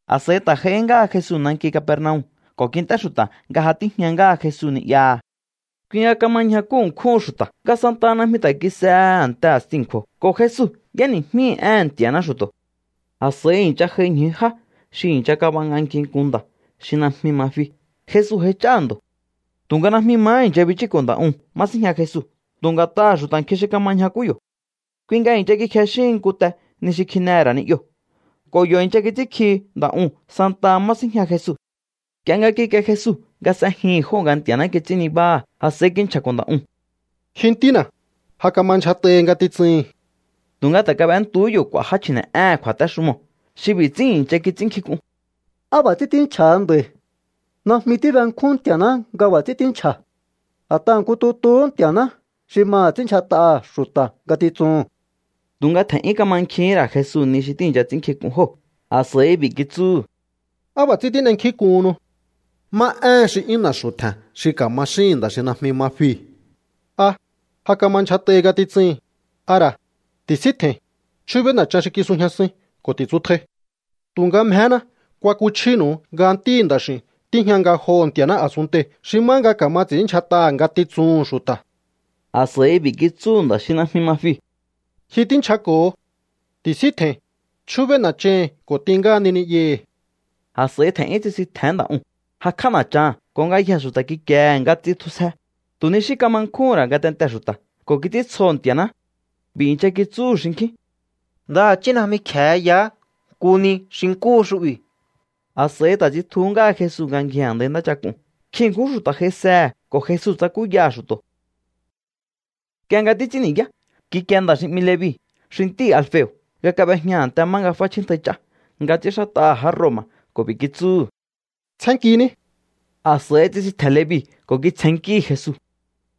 A̱s'a̱i ta̱ j'aihí ngáha Jesu nanki Capernaum ko̱ kint'é xu̱ta̱ nga ja tíjña ngáha Jesu ni'yaha̱. Kui nga kama ñjakú ṉkjúhun xu̱ta̱, nga santaha najmi ta̱ kis'ehe a̱nte a̱sti a̱nkju̱o̱, ko̱ Jesu y'éni̱jmíhi̱ éhe̱n Nti̱a̱ná xu̱to̱. A̱s'a̱i i̱ncha j'ai ñju já xi i̱ncha kab'anganki nku nda̱ xi najmi ma fi. Jesu j'aich'áha̱ ndo̱. Tu̱nga najmi mahá i̱ncha bichúko̱ nda̱ uu̱n má síjña Jesu tu̱ nga̱t'aha̱ xu̱ta̱ nkjin xi kama ñjakú yo̱. Kui nga i̱ncha kikjexíhin nku te ni xi kjinehe̱ ra̱ ni'yoo̱ ko̱ yo̱ i̱ncha kits'ínkjihi nda̱ uu̱n santaha má síjña Jesu. Nk'ie nga kikie Jesu nga s'ejihi̱n jóo̱ nga Nti̱a̱ná kits'ín nibáha̱, a̱s'a̱i kinchja̱ko̱ nda̱ uu̱n: —Ji ntína̱, ja kama ndyjat'ahi ngatitsuhi̱n. Tu̱nga ta̱ kab'entuhú yo̱ k'u̱a̱ já chji̱ne̱'éhe̱n kju̱a̱téxumoo̱ xi b'i̱ ts'ín i̱ncha kits'ínnkjink'un: “¿Á b'a̱ ts'ín tínchja̱ha nda̱i̱? Najmi tíbenkjún Nti̱a̱ná nga b'a̱ ts'ín tínchja̱. A̱t'aha̱ nku tutuhú Nti̱a̱ná xi maha̱ ts'ínndyjat'aha̱ xu̱ta̱ ngatitsuhu̱n.” Tu̱nga tje̱n'yún kamankjihín ra̱ Jesu ni xi tíi̱ncha ts'ínnkjink'un jóo̱. A̱s'a̱i b'i̱ kitsúhu̱: —¿Á b'a̱ ts'ín tín'enkjínk'uhunnu? ¿Má éhen xi 'yún na̱xu̱ tje̱n xi ka̱ma xíhi̱n nda̱ xi najmi ma fii̱? ¿A: “Ja kama ndyjat'ahi ngatitsuhi̱n”? ¿A ra̱: “Ti̱síntje̱i̱n, chjúbéí na̱chan xi kisujñasuin ko̱ ti̱tsutjai”? Tu̱nga mjehéna kuakuchjínu̱u nga Ntíhi̱ Nda̱x'i̱u̱n tíjña ngajoho̱ Nti̱a̱ná a̱sunntei̱ xi má nga ka̱ma ts'i̱ínndyjat'aha̱ ngatitsuhu̱n xu̱ta̱. A̱s'a̱i b'i̱ kitsúhu̱ nda̱ xi najmi ma fiu̱: —Ji tínchjako̱ho. Ti̱síntje̱i̱n, chjúbéí na̱chahi̱n ko̱ t'in ngáhani ni'yahi̱. A̱s'a̱i tje̱n'yún tsisintje̱hén nda̱ uu̱n, jakj'á na̱chaha̱n, ko̱ ngayjee̱ xu̱ta̱ kikiehe̱ nga tsitjusje. Tu̱ ni xí kama nkjúhún ra̱ ngatentee̱ xu̱ta̱ ko̱ kits'íntsjoho̱ Nti̱a̱ná. B'i̱ i̱ncha kitsúhu̱ xinkjín: —Ndaha̱chí najmi kje̱e yaá nku ni xi nkúhu xu'bi̱. A̱s'a̱i ta̱ tsitjuhú ngáha Jesu nga ngji a̱ndai ntáchak'uu̱n. Nkjin ṉkjún xu̱ta̱ j'aisehe̱, ko̱ Jesu tsakúyaha̱ xu̱to̱. Nk'ie nga títs'ín ni̱yá, kikie nda̱ xi 'mi Levi xi ntíhi̱ Alfeo̱ nga kab'ejña a̱nte má nga f'áchjíntjai ch'á nga ts'ínxát'aha̱ já Roma̱ ko̱ b'i̱ kitsúhu̱: —Tsjénnkiní. A̱s'a̱i tsisintje̱n Levi ko̱ kitsjennkíhi̱ Jesu.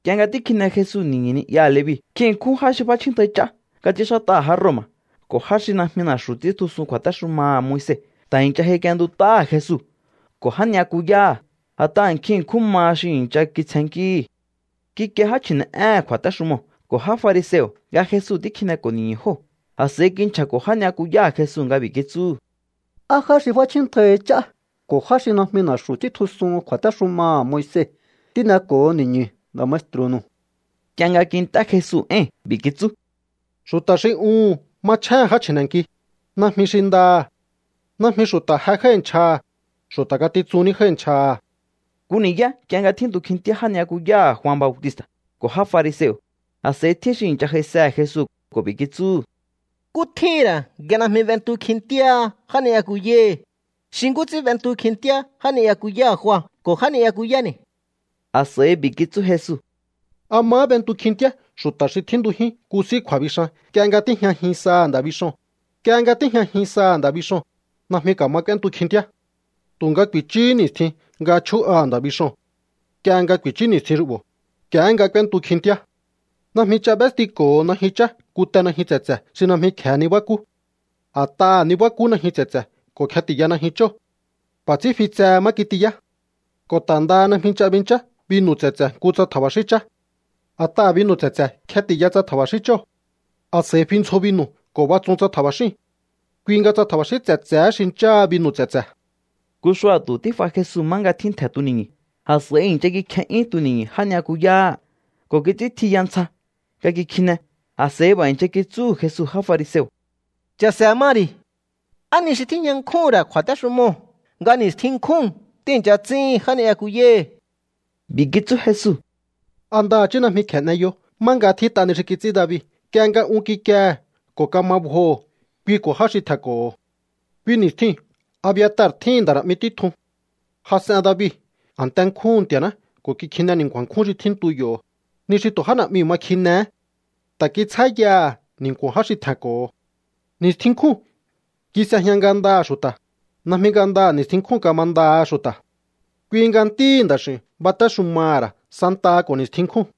Nk'ie nga tíkjine Jesu ni̱ñu̱ ni'yaha̱ Levi, nkjin ṉkjún já xi f'áchjíntjai ch'á nga ts'ínxát'aha̱ já Roma̱ ko̱ já xi najmi na̱xu̱ ts'íntjusun kju̱a̱téxumaha̱ Moise ta̱ i̱ncha j'aik'ientut'áha̱ Jesu ko̱ já ni'yakuyáha̱. A̱t'aha̱ nkjin ṉkjún maha xi i̱ncha kitsjennkíhi̱. Kikie já chji̱ne̱'éhe̱n kju̱a̱téxumoo̱ ko̱ já fariseo̱ nga Jesu tíkjineko̱ ni̱ñu̱ jóo̱. A̱s'a̱i kinchja̱ko̱ já ni'yakuyáha̱ Jesu nga b'i̱ kitsúhu̱: —¿Á já xi f'áchjíntjaihi ch'á ko̱ já xi najmi na̱xu̱ ts'íntjusuhun kju̱a̱téxumaha̱ Moise tíneko̱ho ni̱ñu̱ nda̱ maestru̱nu̱u? Nk'ie nga kint'é Jesu éi̱n, b'i̱ kitsú: —Xu̱ta̱ xi uhu̱n machjéhe̱n já chji̱ne̱nki, najmi xi ndaha̱. Najmi xu̱ta̱ je jái̱ nchjaha̱, xu̱ta̱ ngatitsun ní jái̱ nchjaha̱. Nku ni̱yá nk'ie nga tjíntu kjintíá já ni'yakuyáha̱ Jua Bautista̱ ko̱ já fariseo̱, a̱s'a̱i tjín xi i̱ncha j'aisehe̱ Jesu ko̱ b'i̱ kitsúhu̱: —¿Nkú tjíhi̱n ra̱ nga najmi b'entu kjintíáha já ni'yakuyáhi̱, xi nkú ts'ín b'entu kjintíá já ni'yakuyáha̱ Jua ko̱ já ni'yakuyáni̱? A̱s'a̱i b'i̱ kitsú Jesu: —¿A mahá b'entu kjintíá xu̱ta̱ xi tjíntujín nku s'í kju̱a̱bixan nk'ie nga tíjñajin saha̱ nda̱ bixoo̱n? Nk'ie nga tíjñajin saha̱ nda̱ bixoo̱n, najmi ka̱ma k'úéntu kjintíá. Tu̱nga ku̱i̱chúhú ni̱stjin nga chjú'aha̱ nda̱ bixoo̱n. Nk'ie nga ku̱i̱chú ni̱stjin xu'bo̱, nk'iehé nga k'úéntu kjintíá. ’Najmi ch'a b'éstiko̱ho najyun chá nku te najyun tse̱tse̱ xi najmi kje̱e nibákú. A̱t'aha̱ nibákú najyun tse̱tse̱ ko̱ kjeti̱ya najyun chóo̱. B'a̱ ts'ín fi tsehe má kitiyá. Ko̱ ta̱ ndaha najmi ch'a binchá binu̱ tse̱tse̱ nku tsa tja̱ba̱xín chá. A̱t'aha̱ binu̱ tse̱tse̱ kjeti̱ya tsa tja̱ba̱xín chóo̱. A̱s'a̱i fi ndzjo binu̱ ko̱ batsun tsa tja̱ba̱xíu̱n. Kui nga tsa tja̱ba̱xín tse̱tse̱hé xincháha binu̱ tse̱tse̱. Nku xua̱tu̱ tíf'a Jesu má nga tjíntje̱ tuni̱ñu̱. A̱s'a̱i i̱ncha kikje'yún tuni̱ñu̱ já ni'yakuyáha̱ ko̱ kits'íntjiya ntsja nga kikjine. A̱s'a̱i b'a̱ i̱ncha kitsúhu̱ Jesu já fariseo̱: —Cha̱se̱ ma ri̱. ¿Á ni xi tíjña nkjúhu̱n ra̱ kju̱a̱téxumoo̱ nga ni̱stjin nkjúu̱n tíi̱ncha ts'íhin já ni'yakuyáhi̱? B'i̱ kitsú Jesu: —¿A ndaha̱chí najmi kje̱e n'eyo má nga tjít'a ni xi kits'ín David nk'ie nga un kikiehe̱ ko̱ kama bjoho̱ kui ko̱ já xi tje̱nko̱ho̱? Kui ni̱stjiu̱n Abiatar tjíhi̱n nda̱ na̱'mi títjun. Jas'en David a̱nte nkjúhu̱n Nti̱a̱ná ko̱ kikjine ni̱nku̱a̱n nkjún xi tjíntu yo̱, ni xi tu̱ já na̱'miu̱ ma kjinehé. Ta̱ kitsjá yaha̱ ni̱nku̱o̱n já xi tje̱nko̱ho̱. ’Ni̱stjin nkjúu̱n kis'ejña ngandaha̱ xu̱ta̱, najmi ngandaha̱ ni̱stjin nkjúu̱n kamandaha xu̱ta̱. Kui nga Ntíhi̱ Nda̱x'i̱u̱n batéxumaha̱ ra̱ santaha ko̱ ni̱stjin nkjúu̱n.